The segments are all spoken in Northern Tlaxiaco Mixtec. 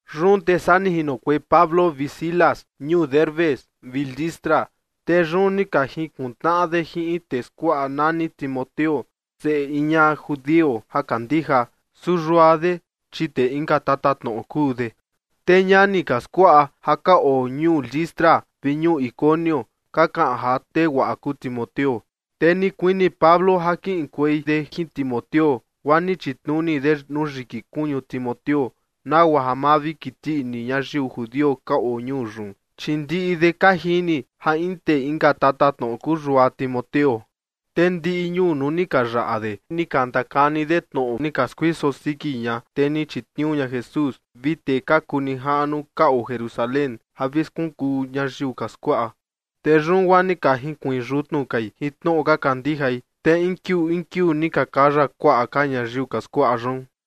Yun te saa ni jinokuei Pablo vi Silas ñuu Derbe vi Listra, te yun ni ka jinkuntnaꞌa de jin in tee skuaꞌa nani Timoteo, seꞌe in ñaꞌa judio ja kandija, su yua de, chi tee inka tatatnoꞌo kuu de. Te ñani ka skuaꞌa ja ka oo ñuu Listra vi ñuu Iconio ka kaꞌan ja tee guaꞌa kuu Timoteo. Te ni kuini Pablo ja kiꞌinkuei de jin Timoteo, guaa ni chitnuni de nuu yiki kuñu Timoteo, nagua ja ma vi kiti ini ñayiu judio ka oo ñuu yun, chi ndiꞌi de ka jini ja in tee inka tatatnoꞌo kuu yua Timoteo. Te ndiꞌi ñuu nuu ni ka yaꞌa de, ni ka ndakani de tnoꞌo ni ka skuiso siki ña tee ni chitniuu ña Jesús vi tee ka kuu nijaꞌnu ka oo Jerusalén ja vi skunkuu ñayiu ka skuaꞌa. Te yun guaa ni ka jinkuiin yutnu kai jin tnoꞌo ka kandijai, te in kiuu in kiuu ni ka kaya kuaꞌa ka ñayiu ka skuaꞌa yun.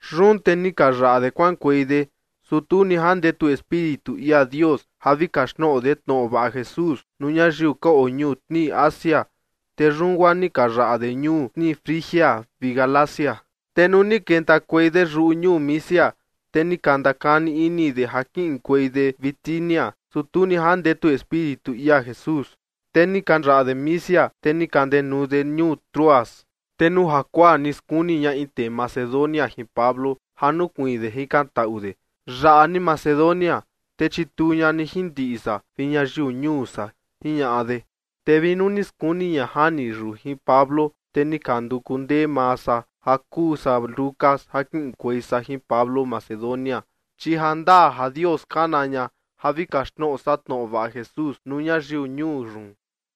Yun te ni ka yaꞌa de kuaꞌankuei de, su tu ni jandetu Espíritu ia Dios ja vi kaxtnoꞌo de tnoꞌo vaꞌa Jesús nuu ñayiu ka oo ñuu tnii Asia. Te yun guaa ni ka yaꞌa de ñuu tnii Frigia vi Galacia. Te nuu ni kentakuei de yuꞌu ñuu Misia, te ni ka ndakani ini de ja kiꞌinkuei de Bitinia, su tu ni jandetu Espíritu ia Jesús. Te ni ka yaꞌa de Misia, te ni ka ndenuu de ñuu Troas. Te nuu jakuaa ni skuni ña in tee Macedonia jin Pablo ja nukuiin de jikantaꞌu de: ―Yaꞌa ni Macedonia, te chituu ña ni jin ndiꞌi san vi ñayiu ñuu san ―jiñaꞌa de. Te vi nuu ni skuni ña jani yun jin Pablo, te ni ka nduku ndee maa san ja kuu san Lucas ja kiꞌinkuei san jin Pablo Macedonia, chi jandaa ja Dios kana ña ja vi kaxtnoꞌo san tnoꞌo vaꞌa Jesús nuu ñayiu ñuu yun.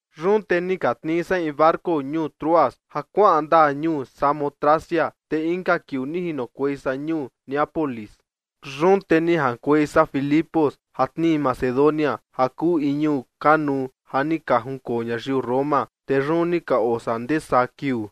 Yun te ni ka tnii san in barco ñuu Troas ja kuaꞌan ndaa ñuu Samotracia, te inka kiuu ni jinokuei san ñuu Neápolis. Yun te ni jaꞌankuei san Filipo ja tnii Macedonia ja kuu in ñuu kanuu ja ni ka junkoo ñayiu Roma. Te yun ni ka oo san ndee saa kiuu.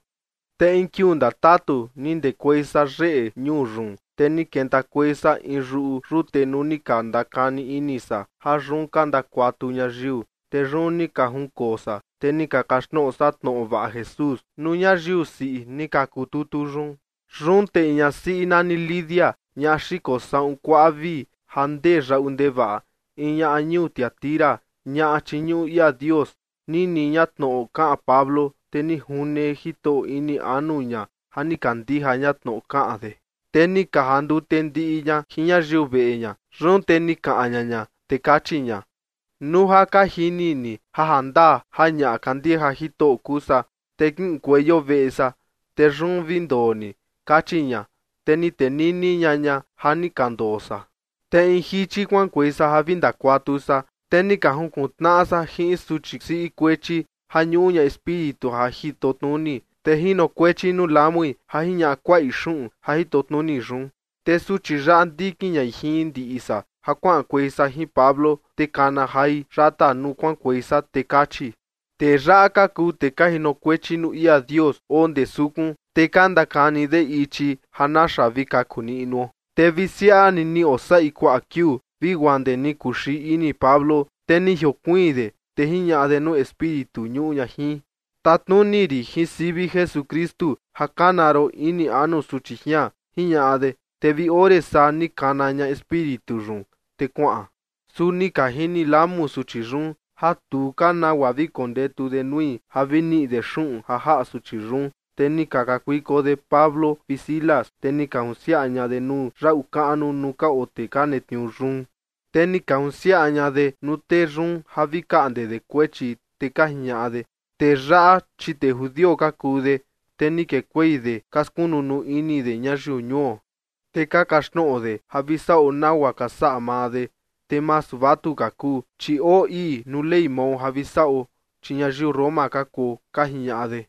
Te in kiuu ndatatu ni ndekuei san yeꞌe ñuu yun, te ni kentakuei san in yuꞌu yute nuu ni ka ndakani ini san ja yun ka ndakuatu ñayiu. Te yun ni ka junkoo san, te ni ka kaxtnoꞌo san tnoꞌo vaꞌa Jesús nuu ñayiu siꞌi ni ka kututu yun. Yun te in ñasiꞌi nani Lidia, ñaꞌa xiko saꞌun kuaꞌa vii ja ndee yaꞌu ndevaꞌa, in ñaꞌa ñuu Tiatira, ñaꞌa chiñuꞌu ia Dios, nini ña tnoꞌo kaꞌan Pablo, te ni june Jitoꞌo ini anu ña ja ni kandija ña tnoꞌo kaꞌan de. Te ni ka jandute ndiꞌi ña jin ñayiu veꞌe ña. Yun te ni kaꞌan ña ña, te kachi ña: ―Nuu ja ka jini ni ja jandaa ja ñaꞌa kandija Jitoꞌo kuu san, te kiꞌinkueio veꞌe san, te yun vi ndoo ni ―kachi ña. Te ni tenini ña ña, ja ni ka ndoo san. Te in jichi kuaꞌankuei san ja vi ndakuatu san, te ni ka junkuntnaꞌa san jin in suchi siꞌi kuechi ja ñuꞌu ña espíritu ja jitotnuni, te jinokuechi nuu lamui ja jiñaꞌa kuaꞌi xuꞌun ja jitotnuni yun. Te suchi yaꞌa ndikin ñai jin ndiꞌi san ja kuaꞌankuei san jin Pablo, te kana jai yata nuu kuaꞌankuei san, te kachi: ―Tee yaꞌa ka kuu tee ka jinokuechi nuu ia Dios oo ndee sukun, te ka ndakani de ichi ja naxa vi kaku niꞌnuo. Te vi siaꞌa ni ni oo saꞌi kuaꞌa kiuu, vi guaa ndee ni kuxii ini Pablo, te ni jiokuiin de, te jiñaꞌa de nuu espíritu ñuꞌu ña jin: ―Tatnuni rin jin sivi Jesukristu ja kana ron ini anu suchi jian ―jiñaꞌa de. Te vi ore saa ni kana ña espíritu yun, te kuaꞌan. Su ni ka jini lamu suchi yun ja tu ka nagua vi kondetu de nui ja vi niꞌi de xuꞌun ja jaꞌa suchi yun, te ni ka kakuiko de Pablo vi Silas, te ni ka junsiaꞌa ña de nuu yaꞌu kaꞌnu, nuu ka oo tee ka netniuu yun. Te ni ka junsiaꞌa ña de nuu tee yun ja vi kaꞌnde de kuechi, te ka jiñaꞌa de: ―Tee yaꞌa, chi tee judio ka kuu de, te ni kekuei de ka skunu nuu ini de ñayiu ñuo. Te ka kaxtnoꞌo de ja vi saꞌo nagua ka saꞌa maa de, te masu vatuka kuu, chi oo ii nuu ley mao ja vi saꞌo, chi ñayiu Roma ka kuo ―ka jiñaꞌa de.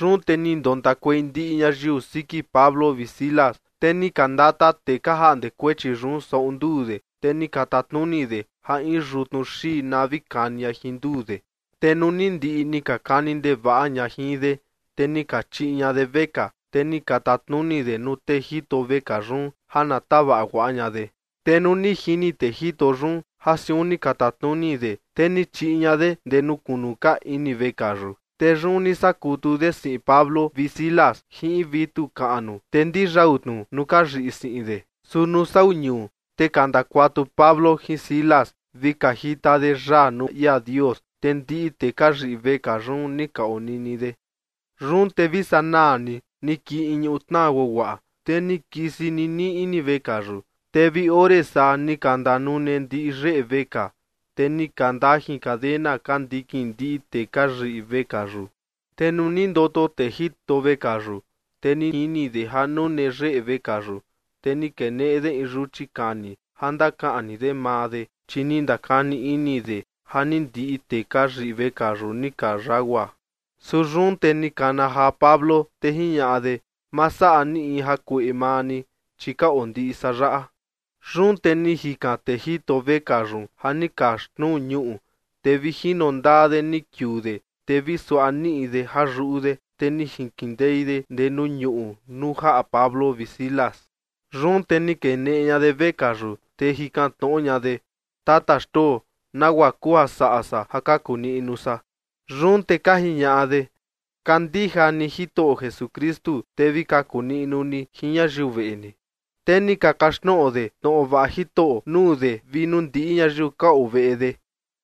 Yun te ni ndontakuei ndiꞌi ñayiu siki Pablo vi Silas. Te ni ka ndata tee ka jaꞌnde kuechi yun saꞌun nduu de, te ni ka tatnuni de ja in yutnu xii na vi kani ña jin nduu de. Te nuu ni ndiꞌi ni ka kani ndevaꞌa ña jin de, te ni ka chiꞌi ña de vekaa, te ni ka tatnuni de nuu tee jito vekaa yun ja na tavaꞌa guaꞌa ña de. Te nuu ni jini tee jito yun ja siun ni ka tatnuni de, te ni chiꞌi ña de ndee nuu kunu ka ini vekaa yun. Te yun ni saꞌa kutu de siꞌin Pablo vi Silas jin in vitu kaꞌnu, te ndiyau tnu nuu ka yiꞌi siꞌin de. Su nuu sau ñuu, te ka ndakuatu Pablo jin Silas vi ka jita de yaa nuu ia Dios, te ndiꞌi tee ka yiꞌi vekaa yun ni ka onini de. Yun te vi sanaa ni, ni kii in ñutnaa guaguaꞌa, te ni kisi ninii ini vekaa yun. Te vi ore saa ni ka ndanune ndiꞌi yeꞌe vekaa, te ni ka ndajin cadena ka ndikin ndiꞌi tee ka yiꞌi vekaa yun. Te nuu ni ndoto tee jito vekaa yun, te ni jini de ja nune yeꞌe vekaa yun, te ni keneꞌe de in yuchi kani, ja ndakaꞌni de maa de, chi ni ndakani ini de ja ni ndiꞌi tee ka yiꞌi vekaa yun ni ka yagua. Su yun te ni kana jaa Pablo, te jiñaꞌa de: ―¡Ma saꞌa ni in jakueꞌe maa ni! Chi ka oo ndiꞌi san yaꞌa. Yun te ni jikan tee jito vekaa yun ja ni ka xnuu ñuꞌu, te vi jino ndaa de ni kiuu de, te vi suaꞌa niꞌi de ja yuꞌu de, te ni jinkindei de ndee nuu ñuꞌu nuu jaꞌa Pablo vi Silas. Yun te ni keneꞌe ña de vekaa yun, te ni jikan tnoꞌo ña de: ―¿Tata xtoo, nagua kuu ja saꞌa san ja kaku niꞌnu san? Yun te ka jiñaꞌa de: ―Kandija ni Jitoꞌo Jesukristu, te vi kaku niꞌnu ni jin ñayiu veꞌe ni. Te ni ka kaxtnoꞌo de tnoꞌo vaꞌa Jitoꞌo nuu de vi nuu ndiꞌi ñayiu ka oo veꞌe de.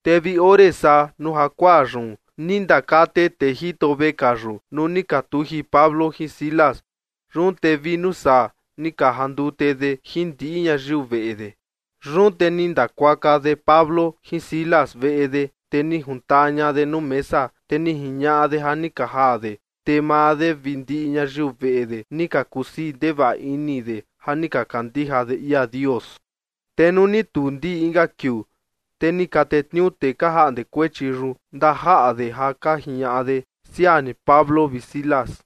Te vi ore saa nuu jakuaa yun, ni ndakate tee jito vekaa yun nuu ni ka tuji Pablo jin Silas. Yun te vi nuu saa, ni ka jandute de jin ndiꞌi ñayiu veꞌe de. Yun te ni ndakuaka de Pablo jin Silas veꞌe de, te ni juntaa ña de nuu mesa, te ni jiñaꞌa de ja ni ka jaa de. Te maa de vi ndiꞌi ñayiu veꞌe de ni ka kusii ndevaꞌa ini de ja ni ka kandija de ia Dios. Te nuu ni tuu ndii inka kiuu, te ni ka tetniuu tee ka jaꞌnde kuechi yun ndajaꞌa de ja ka jiñaꞌa de: ―Siaa ni Pablo vi Silas.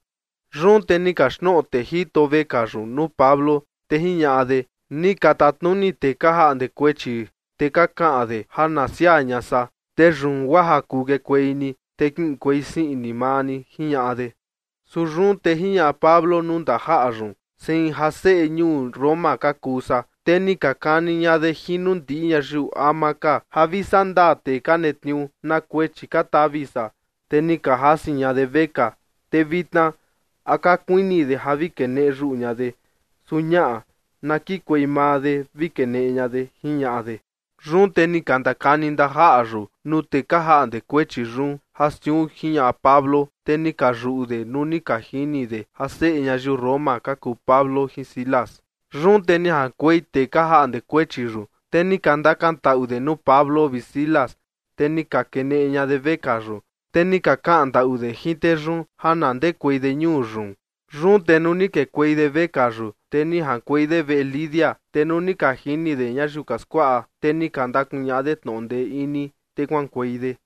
Yun te ni kaxtnoꞌo tee jito vekaa yun nuu Pablo, te jiñaꞌa de: ―Ni ka tatnuni tee ka jaꞌnde kuechi, te ka kaꞌan de ja na siaa ña san. Te yun guaa ja kuu kekuei ni, te kiꞌinkuei sii ini maa ni ―jiñaꞌa de. Su yun te jiñaꞌa Pablo nuu ndajaꞌa yun: ―Sein ja seꞌe ñuu Roma ka kuu san, te ni ka kani ña de jin nuu ndiꞌi ñayiu ama ka ja vi saꞌa ndaa tee ka netniuu na kuechi ka tavi san. Te ni ka jasi ña de vekaa, te vitna, ¿a ka kuini de ja vi keneꞌe yuꞌu ña de? Su, ñaꞌa. Na kikuei maa de vi keneꞌe ña de ―jiñaꞌa de. Yun te ni ka ndakani ndajaꞌa yun nuu tee ka jaꞌnde kuechi yun ja siun jiñaꞌa Pablo. Te ni ka yuꞌu de nuu ni ka jini de ja seꞌe ñayiu Roma ka kuu Pablo jin Silas. Yun te ni jaꞌankuei tee ka jaꞌnde kuechi yun, te ni ka ndakantaꞌu de nuu Pablo vi Silas, te ni ka keneꞌe ña de vekaa yun, te ni ka kaꞌan ndaꞌu de jin tee yun ja na ndekuei de ñuu yun. Yun te nuu ni kekuei de vekaa yun, te ni jaꞌankuei de veꞌe Lidia. Te nuu ni ka jini de ñayiu ka skuaꞌa, te ni ka ndakuñaꞌa de tnoꞌo ndee ini, te kuaꞌankuei de.